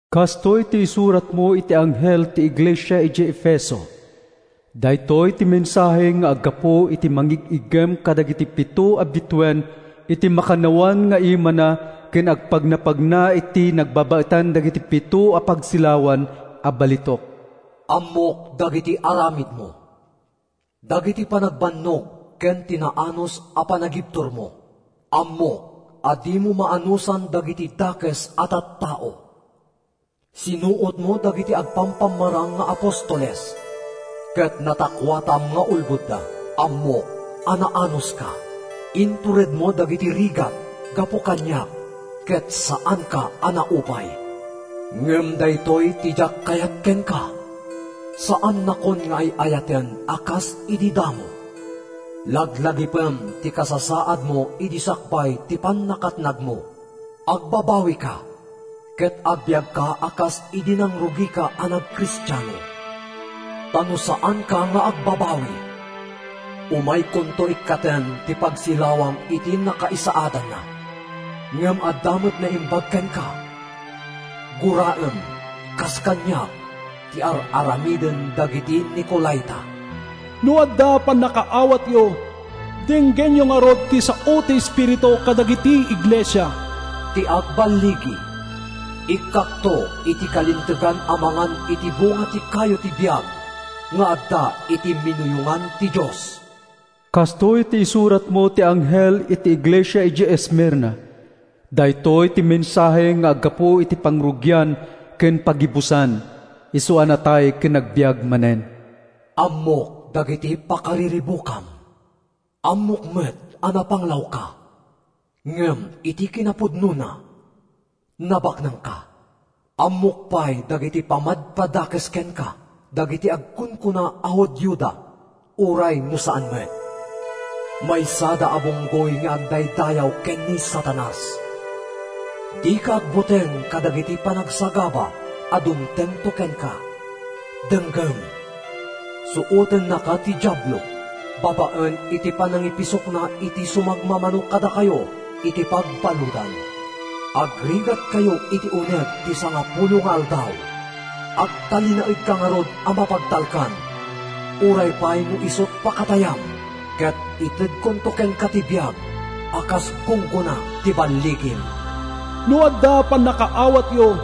“Kastoy ti isuratmo iti anghel ti iglesia idiay Efeso: “Daytoy ti mensahe nga aggapu iti mangig-iggem kadagiti pito a bituen iti makannawan nga imana ken agpagnapagna iti nagbabaetan dagiti pito a pagsilawan a balitok: Ammok dagiti aramidmo, dagiti panagbannog ken ti naanus a panagibturmo. Ammok a dimo maanusan dagiti dakes a tattao. Sinuotmo dagiti agpampamarang nga apostoles, ket natakkuatam nga ulbodda. Ammok a naanuska. Inturedmo dagiti rigat gapu kaniak ket saanka a naupay. Ngem daytoy ti diak kayat kenka: saannakon nga ay-ayaten a kas idi damo. Laglagipem ti kasasaadmo idi sakbay ti pannakatnagmo. Agbabawika ket agbiagka a kas idi nangrugika a nagkristiano. Ta no saanka nga agbabawi, umaykonto ikkaten ti pagsilawam iti nakaisaadanna. Ngem adda met naimbag kenka: guraem, kas kaniak, ti ar-aramiden dagiti Nicolaita. “No adda pannakaawatyo, denggenyo ngarud ti sao ti Espiritu kadagiti iglesia: “Ti agballigi, ikkakto iti kalintegan a mangan iti bunga ti kayo ti biag nga adda iti minuyongan ti Dios.” “Kastoy ti isuratmo iti anghel iti iglesia idiay Esmirna: “Daytoy ti mensahe nga aggapu iti Pangrugian ken Paggibusan, isu a natay ken nagbiag manen: Ammok dagiti pakariribukam. Ammok met a napanglawka, ngem iti kinapudnona, nabaknangka! Ammok pay dagiti pammadpadakes kenka dagiti agkunkuna a Judioda uray no saan met. Maysada a bunggoy nga agdaydayaw ken ni Satanas. Dika agbuteng kadagiti panagsagaba a dumtengto kenka. Denggem, suotennaka ti Diablo babaen iti panangipisokna iti sumagmamano kadakayo iti pagbaludan. Agrigatkayto iti uneg ti sangapulo nga aldaw. Agtalinaedka ngarud a mapagtalkan uray pay no isut’ pakatayam ket itedkonto kenka ti biag a kas gunggona ti balligim. “No adda pannakaawatyo,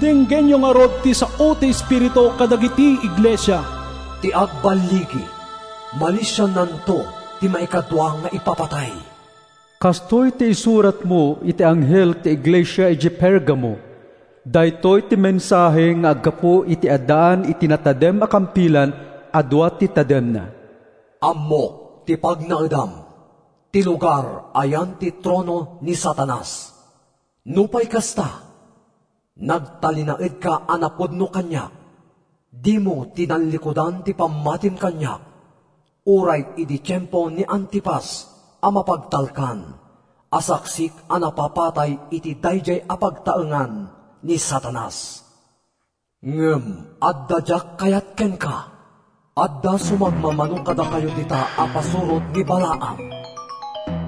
denggenyo ngarud ti sao ti Espiritu kadagiti iglesia: “Ti agballigi, malisiannanto ti maikadua nga ipapatay.” “Kastoy ti isuratmo iti anghel ti iglesia idiay Pergamo: “Daytoy ti mensahe nga aggapu iti addaan iti natadem a kampilan a dua ti tademna: Ammok ti pagnaedam—ti lugar a yan ti trono ni Satanas. Nupay kasta, nagtalinaedka a napudno kaniak. Dimo tinallikudan ti pammatim kaniak uray idi tiempo ni Antipas a mapagtalkan a saksik a napapatay iti daydiay a pagtaengan ni Satanas. Ngem adda diak kayat kenka: adda sumagmamano kadakayo dita a pasurot ni Balaam.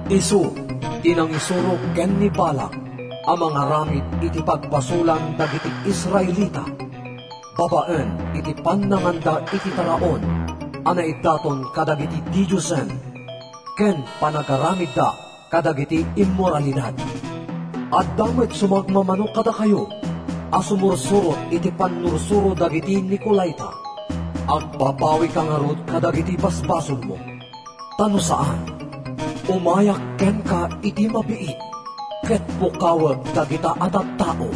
Isu ti nangisuro ken ni Balak a mangaramid iti pagbasolan dagiti Israelita babaen iti pannanganda iti taraon a naidaton kadagiti didiosen ken panagaramidda kadagiti immoralidad. Adda met sumagmamano kadakayo a sumursurot iti pannursuro dagiti Nicolaita. Agbabawika ngarud kadagiti basbasolmo. Ta no saan, umayak kenka iti mabiit ket pukawek dagita a tattao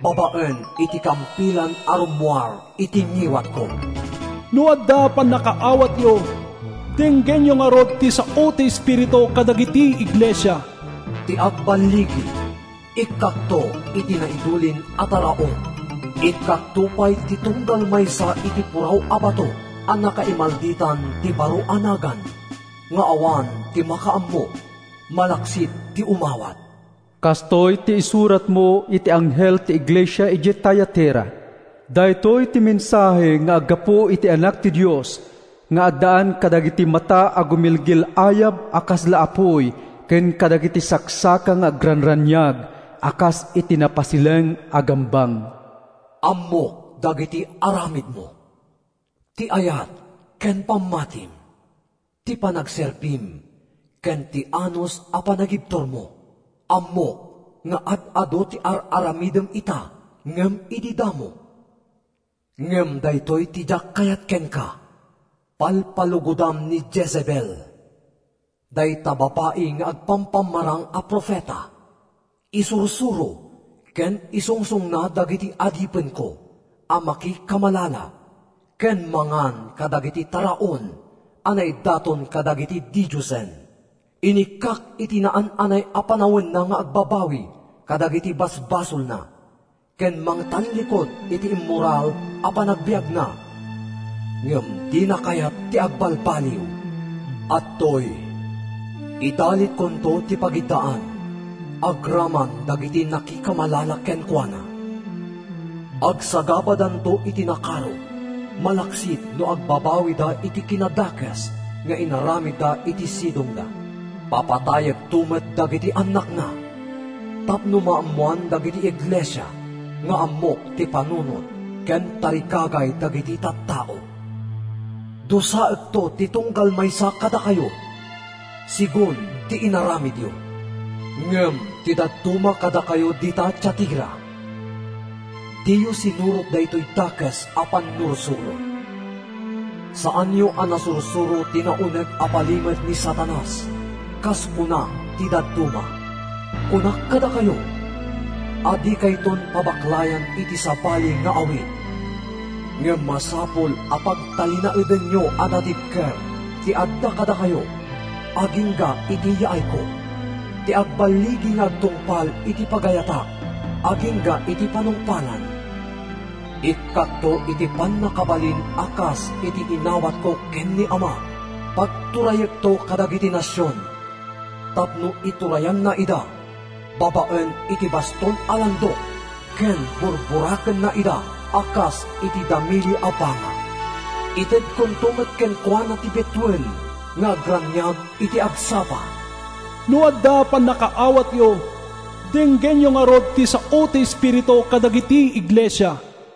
babaen iti kampilan a rummuar iti ngiwatko. “No adda pannakaawatyo, denggenyo ngarud ti kuna ti Espiritu kadagiti iglesia: “Ti agballigi, ikkakto iti naidulin a taraon. Ikkakto pay ti tunggal maysa iti puraw a bato a nakaimalditan ti baro a nagan nga awan ti makaammo malaksid ti umawat.” “Kastoy ti isuratmo iti anghel ti iglesia idiay Tiatira: “Daytoy ti mensahe nga aggapu iti Anak ti Dios nga addaan kadagiti mata a gumilgil-ayab a kasla apuy ken kadagiti saksaka nga agranraniag a kas iti napasileng a gambang. Ammok dagiti aramidmo, ti ayat ken pammatim, ti panagserbim ken ti naanus a panagibturmo. Ammok nga ad-adu ti ar-aramidem ita ngem idi damo. Ngem daytoy ti diak kayat kenka: palpalugodam ni Jezebel, dayta babai nga agpampamarang a profeta. Isursuro ken isungsongna dagiti adipenko a makikamalala ken mangan kadagiti taraon a naidaton kadagiti didiosen. Inikkak iti naan-anay a panawenna nga agbabawi kadagiti basbasolna ken mangtallikud iti immoral a panagbiagna, ngem dina kayat ti agbalbaliw. Adtoy, idalitkonto iti pagiddaan, agraman dagiti nakikamalala kenkuana. Agsagabadanto iti nakaro malaksid no agbabawida iti kinadakes nga inaramidda iti sidongna. Papatayekto met dagiti annakna tapno maammoan dagiti iglesia nga ammok ti panunot ken tarigagay dagiti tattao. Dusaekto ti tunggal maysa kadakayo, segun ti inaramidyo. “Ngem ti dadduma kadakayo dita Tiatira, diyo sinurot daytoy dakes a pannursuro. Saanyo a nasursuro ‘ti nauneg a palimed ni Satanas,’ kas kuna ti dadduma. Kunak kadakayo a dikayton pabaklayan iti sabali nga awit. Ngem masapul a pagtalinaedenyo a natibker ti adda kadakayo agingga iti yaayko. Ti agballigi nga agtungpal iti pagayatak agingga iti panungpalan, ikkakto iti pannakabalin a kas iti inawatko ken ni Amak: Pagturayekto kadagiti nasion tapno iturayanna ida babaen iti baston a landok ken burburakenna ida a kas iti damili a banga. Itedkonto met kenkuana ti bituen nga agraniag iti agsapa. “No adda pannakaawatyo, denggenyo ngarud ti sao ti Espiritu kadagiti iglesia.”